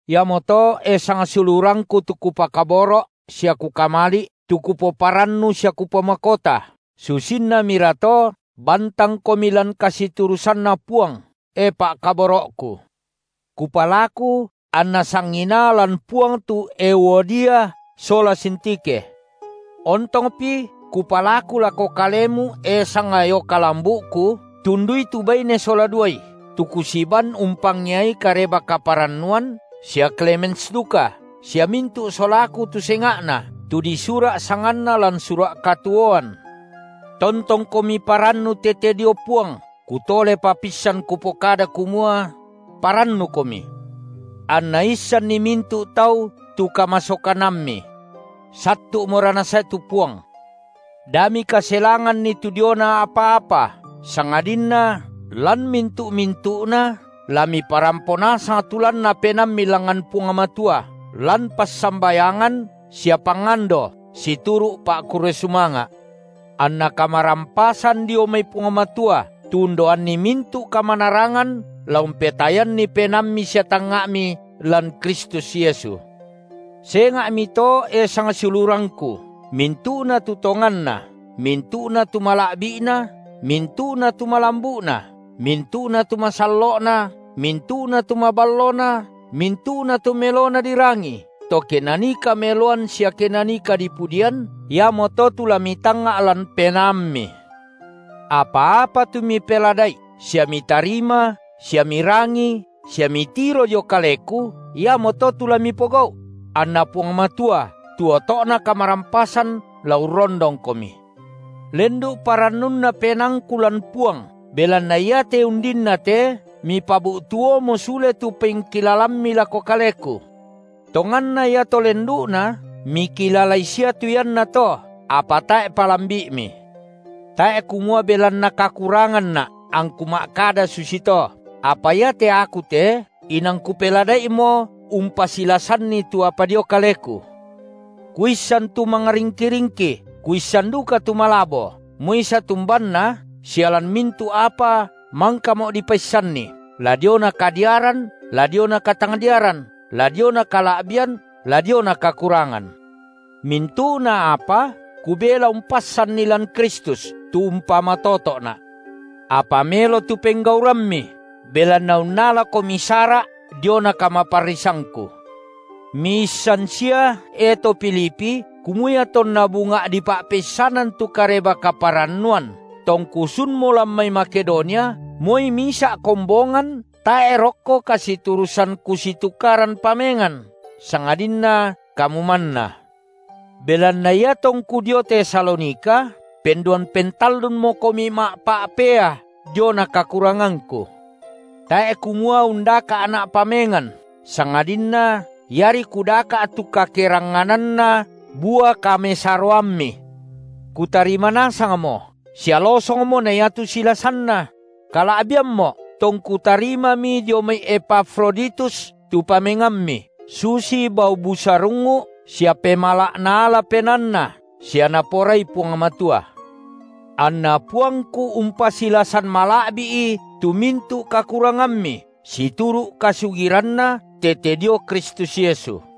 Iamoto, e sangsiulurangku tu kupakaboro’ sia kukamali’, tu kupoparannu sia kupomakota, susinnamirato bantangkomi lan kasiturusanna Puang, e pa’kaboro’ku. Kupalaku anna sanginaa lan Puang tu Euodia sola Sintikhe. Ontongpi kupalaku lako kalemu e sangayoka lambu’ku, tundui tu baine sola duai, tu kusiban umpangeai Kareba-kaparannuan sia Klemens duka, sia mintu’ solaku tu senga’na, tu disura’ sanganna lan sura’ katuoan. Tontongkomi parannu tete dio Puang, kutolepa pissan kupokada kumua: parannukomi. Anna issanni mintu’ tau tu kamasokanammi. Sattu’mora Nasae tu Puang. Da mikaselanganni tu diona apa-apa, sangadinna lan mintu’-mintu’na la miparampo nasang tu lanna penaammi langngan Puang Matua lan kapassambayangan sia pangando situru’ pa’kurre sumanga’. Anna kamarampasan dio mai Puang Matua, tu undaoanni mintu’ kamanarangan la umpetayanni penaammi sia tangnga’mi lan Kristus Yesu. Senga’mito, e sangsiulurangku, mintu’na tu tonganna, mintu’na tu mala’bi’na, mintu’na tu malambu’na, mintu’na tu masallo’na, mintu’na tu maballona, mintu’na tu melona dirangi, to ke nanii kameloan sia ke nanii kadipudian, iamoto tu la mitangnga’ lan penaammi. Apa-apa tu mipelada’i sia mitarima sia mirangi sia mitiro dio kaleku, iamoto tu la mipogau’; anna Puang Matua, tu oto’na kamarampasan, la urrondongkomi. Lendu’ parannunna penaangku lan Puang, belanna iate undinnate, mipabu’tuomo sule tu pengkilalammi lako kaleku. Tonganna iato lendu’na, mikilalai sia tu iannato, apa tae’ palambi’mi. Tae’ kumua belanna kakuranganna’ angku ma’kada susito, apa iate aku te inang kupelada’imo umpasilasanni tu apa dio kaleku. Kuissan tu mangringki-ringki, kuissan duka tu malabo, moi satumbanna, sia lan mintu’ apa mangkamo’ dipaissanni, la diona kadiaran la diona katangdiaran, la diona kala’bian la diona kakurangan. Mintu’na apa kubela umpassanni lan Kristus, tu umpamatoto’na’. Apa melo tu penggaurammi, belanna unnalakomi sara’ diona kamaparrisangku. Miissan sia, e to Filipi, kumua iatonna bunga’ dipa’peissanan tu Kareba-kaparannuan, tongku sunmo lan mai Makedonia, moi misa’ kombongan tae’ rokko kasiturusan kusitukaran pamengan, sangadinna kamu manna. Belanna iatongku dio Tesalonika penduan pentallunmokomi ma’pa’pea diona kakurangangku. Tae’ kumua undaka’na’ pamengan, sangadinna iari kudaka’ tu kakerangngananna bua kamesaroammi. Kutarima nasangmo sia losongmo na iatu silasanna; kala’biammo’, tongku tarimami dio mai Epafroditus tu pamengammi, susi bau busarungngu’ sia pemala’ naala penaanNa sia Naporai Puang Matua. Anna Puangku umpasilasan mala’bi’i tu mintu’ kakurangammi situru’ kasugiranNa tete dio Kristus Yesu.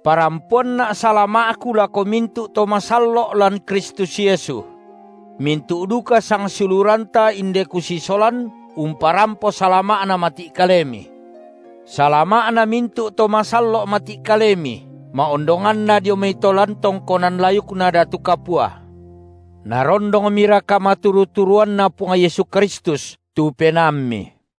Parampoanna’ salama’ku lako mintu’ to masallo’ lan Kristus Yesu. Mintu’ duka sangsiuluranta inde kusolan umparampo salama’na mati’ kalemi. Salama’na mintu’ to masallo’ mati’ kalemi, ma’ondonganna dio mai to lan tongkonan layukna datu kapua. Narondongmira kamaturu-turuanNa Puang Yesu Kristus tu penaammi.